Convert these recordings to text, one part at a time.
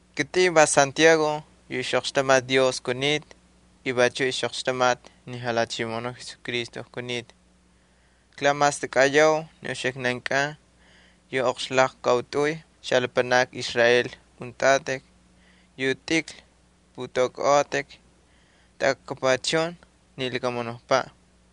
Kitꞌin va kSantiago yu ixꞌoqxtamati Dios y vachuꞌ ixꞌoqxtamati ni Jalhachimoꞌonu Jesucristo kunita. Klamastakꞌayau ni uxiknan yu oqxlaqkautꞌuy xalapanakni Israel untꞌatꞌik yu tꞌikl pꞌutꞌaukꞌaꞌotꞌik taꞌakapuchun ni lakamunukpaꞌ.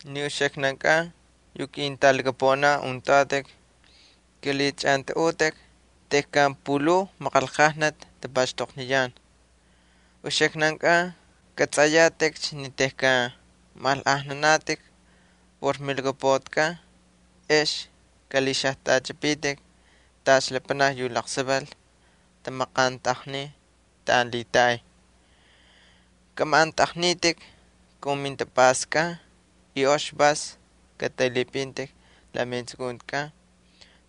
Ni uxiknan yu ketꞌalaqaunin, kꞌalhiꞌachꞌantꞌaꞌutꞌik tejkan pulhuu maqanlqajnati tapaxtoqniyan. Uxiknan kꞌatsꞌayatꞌikcha ni tejkan maꞌanlꞌajnanatꞌik por milhakapuꞌatikꞌan ex kꞌalhixajtꞌachipitik tacha lapanakni yu laqsaval tamaqantꞌaqniy taꞌan lhitaꞌay. Kꞌamaꞌantꞌaqnitꞌik kun mintapꞌastkꞌan y ox vas katꞌaylhipꞌintꞌik la metsukuntikꞌan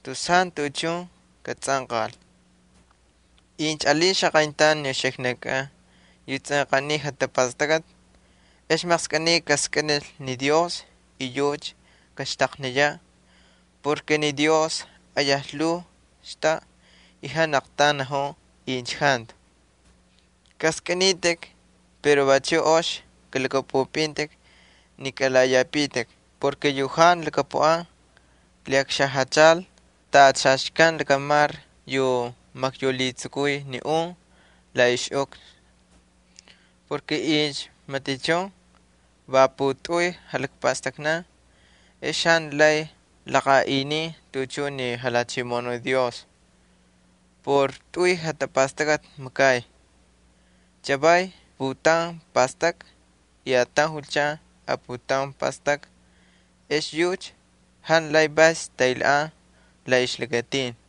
tus jantu tuꞌuchun katsꞌanqal. Incha alin xaqayntaun ni uxiknankꞌan yu tsꞌanqaniy jatapastakꞌati, ex maqskꞌiniy kaskꞌinil ni Dios y yucha kaxtaqniyaꞌ. Ni Dios ayaj lhuu xtaꞌa y jantu aqtaun najun incha jantu. Kꞌaskꞌinitꞌik pero vachuꞌ ox kalhakꞌapꞌupꞌintꞌik ni kalaꞌaꞌiyapitik porke yu jantu lhakapuꞌan lhiꞌakxajachal tacha xaxkan lakamar yu maqyaulhitsukuy ni un la ixꞌukxna. Incha matichun va putꞌuy jalakpastaknan ex jantu lay laqaꞌiniy tuꞌuchun ni Jalhachimoꞌonu Dios por tꞌuy jatapastakꞌati makay. Chavay putaun pastakꞌa y ataun julchan aputaun pastakꞌa ex yucha jantu lay vas taylhaꞌan la ixlakatin.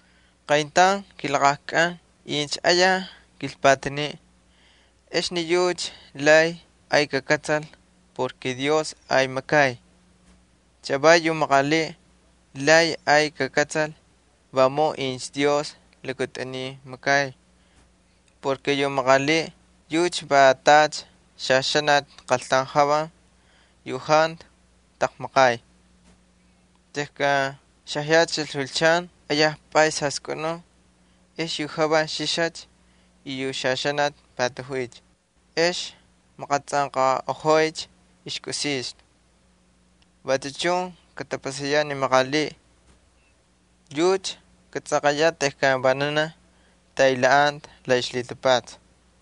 Qayntaun kilaqajkꞌan incha ayaj kilpataniꞌ ex ni yucha lay ay kakꞌatsal porke Dios ay makay. Chavay yu maqaliꞌ lay ay kakꞌatsal vamun incha Dios lakatꞌuniy makay. Yu maqaliꞌ yucha va tacha xaxanati qaltaun javan yu jantu taqmaqay. Tejkan xajachil julchan ayaj pꞌays jaskꞌunun ex yu javan xixacha y yu xaxanati patajuycha ex maqatsꞌanqaꞌojoycha ixkꞌusixtu. Vachu chun katapasayaꞌ ni maqaliꞌ, yucha katsꞌanqayaꞌ tejkan vananaj taylhaꞌan la ixlhitapatsa.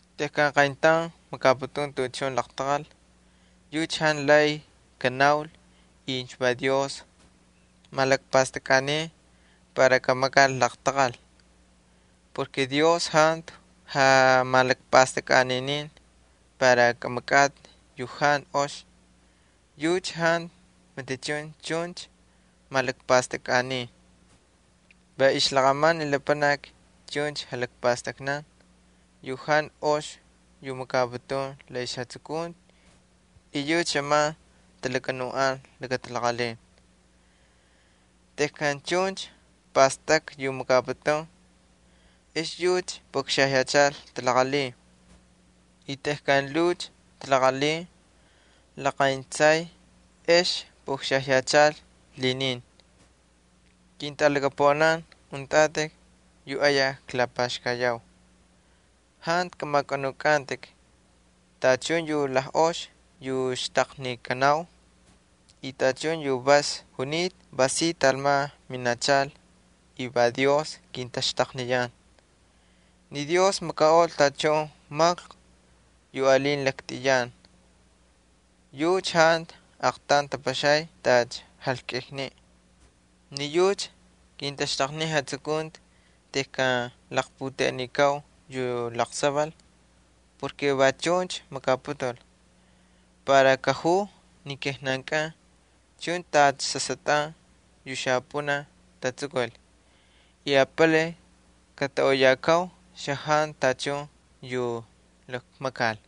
Tejkan qayntaun makaputun tuꞌuchun laqtaqal yucha jantu lay kanaul incha va Dios malakpastakꞌaniy para kamakal laqtaqal. Dios jantu jamalakpastakꞌaninin para kꞌamakꞌatꞌi yu jantu ox. Yucha jantu matichun chuncha malakpastakꞌaniy. Va ixlaqꞌaman ni lapanaki chuncha jalakpastaknan yu jantu ox yu makaputun la ixjatsukunti y yucha xꞌaman maqxtaqkan para kachꞌapakal. Tejkan chuncha pastakꞌa yu makaputun ex yucha puꞌakxajyachal talaqalhin y tejkan lhuucha talaqalhin laqayntsay ex puꞌakxajyachal lhinin. Ketꞌalaqaunin yu klapaxkayau, jantu kꞌamakꞌanukꞌantꞌik. Tachun yu lajꞌox yu xtaqnikanau y tachun yu vas junita va si talman minachal y va Dios kintaxtaqniyan. Ni Dios makaꞌol tachun maklku yu alin laktꞌiyan. Yucha jantu aqtaun tapaxay tacha tapaxay jalkꞌikniꞌ. Ni yucha kintaxtaqnin jatsukunti tejkan laqputeꞌenikau yu laqsaval. Va chuncha makaputul para kajuu ni kijnankꞌan chuncha tacha sasꞌatꞌan yu xapꞌunaj tatsukul yu apalay lhiꞌaynikan xajantu tachun yu lakmakal.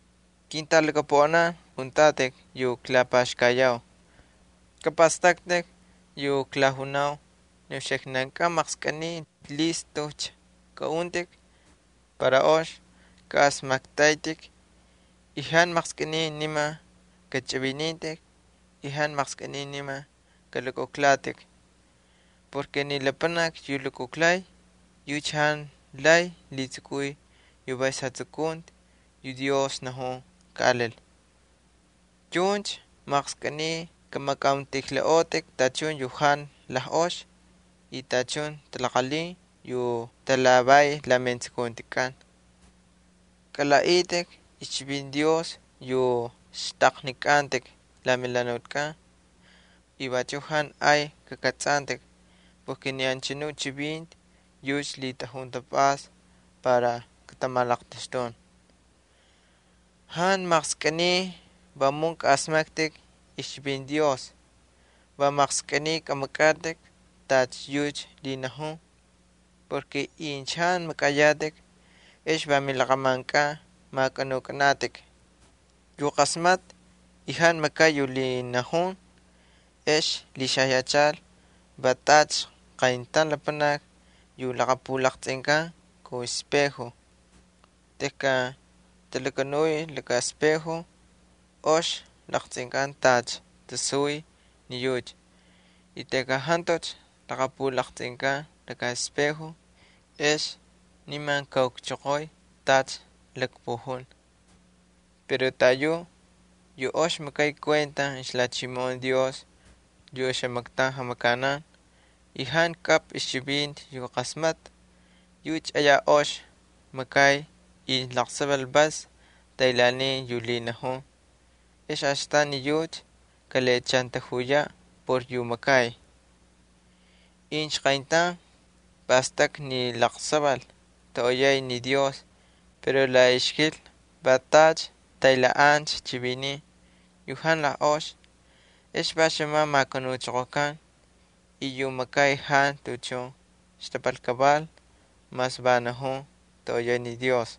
Ketꞌalaqaunin yu klapaxkayau, kapꞌastꞌaktꞌik yu klajunau, ni uxiknankꞌan maqskꞌiniy listujcha kꞌaꞌuntꞌik para ox kaꞌasmaktꞌaytꞌik. Jantu maqskꞌiniy niman kachꞌivinintꞌik y jantu maqskꞌiniy niman kꞌalukujlatꞌik. Ni lapanaki yu lukujlay yucha jantu lay lhitsukuy yu vas jatsukunti yu Dios najun kaꞌalil. Chuncha maqskꞌiniy kꞌamakꞌauntꞌijlaꞌotꞌik tachun yu jantu lajꞌox y tachun talaqalhin yu talhavay la metsukuntikꞌan. Kalaꞌaꞌitꞌik ixchivinti Dios yu xtꞌaqnikꞌantꞌik la melhanutkꞌan y vachu jantu ay kakꞌatsꞌantꞌik. Ni anchanu chivinti yucha lhitꞌajun tapꞌasta para katamalaqtaxtun. Jantu maqskꞌiniy vamun kaꞌasmaktꞌik ixchivinti Dios, va maqskꞌiniy kꞌamakꞌatꞌik tacha yucha lhinajun. Incha jantu makꞌayatꞌik, ex va milaqꞌamankꞌan makꞌanukꞌanatꞌik. Yu qasmatꞌa y jantu makay yu lhinajun ex lhixajyachal va tacha qayntaun lapanaki yu laqapulaqtsꞌinkan kun speju. Tejkan talakanuy laka speju ox laqtsꞌinkan tacha tasuy ni yucha y tejkan jantucha laqapulaqtsꞌinkan laka speju ex niman kaukchoqoy tacha lakpujun. Pero taꞌayucha yu ox makay kuenta ixlhachimoꞌon Dios yu oxamaktaun jamakanan, y jantu kꞌapꞌa ixchivinti yu qasmatꞌa, yucha ayaj ox makay incha laqsaval vas taylhaaniy yu lhinajun, ex astan ni yucha kalhiꞌachantajuyaꞌ por yu makay. Incha qayntaun pastakꞌa ni laqsaval toꞌoyay ni Dios pero la ixkilna va tacha taylhaꞌancha chiviniꞌ yu jantu lajꞌox ex va xꞌamancha makanuchoqokan y yu makay jantu tuꞌuchun xtapal kaval mas va najun toꞌoyay ni Dios.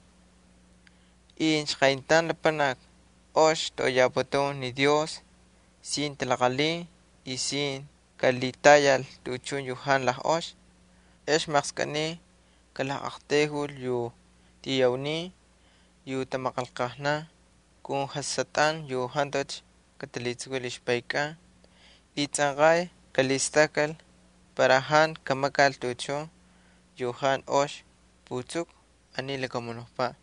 Incha qayntaun lapanaki ox toꞌoyaputun ni Dios sin talaqalhin y sin kalhitayal tuꞌuchun yu jantu lajꞌox, ex maqskꞌiniy kalaqꞌaqtayjul yu tiyaunin yu tamaqanlqajnan kun jasꞌatꞌan yu jantucha katalhitsukul ixpayankꞌan. Vachu tsꞌanqay kalhistakkal para jantu kamakal tuꞌuchun yu jantu ox putsuku aniy lakamunukpaꞌ.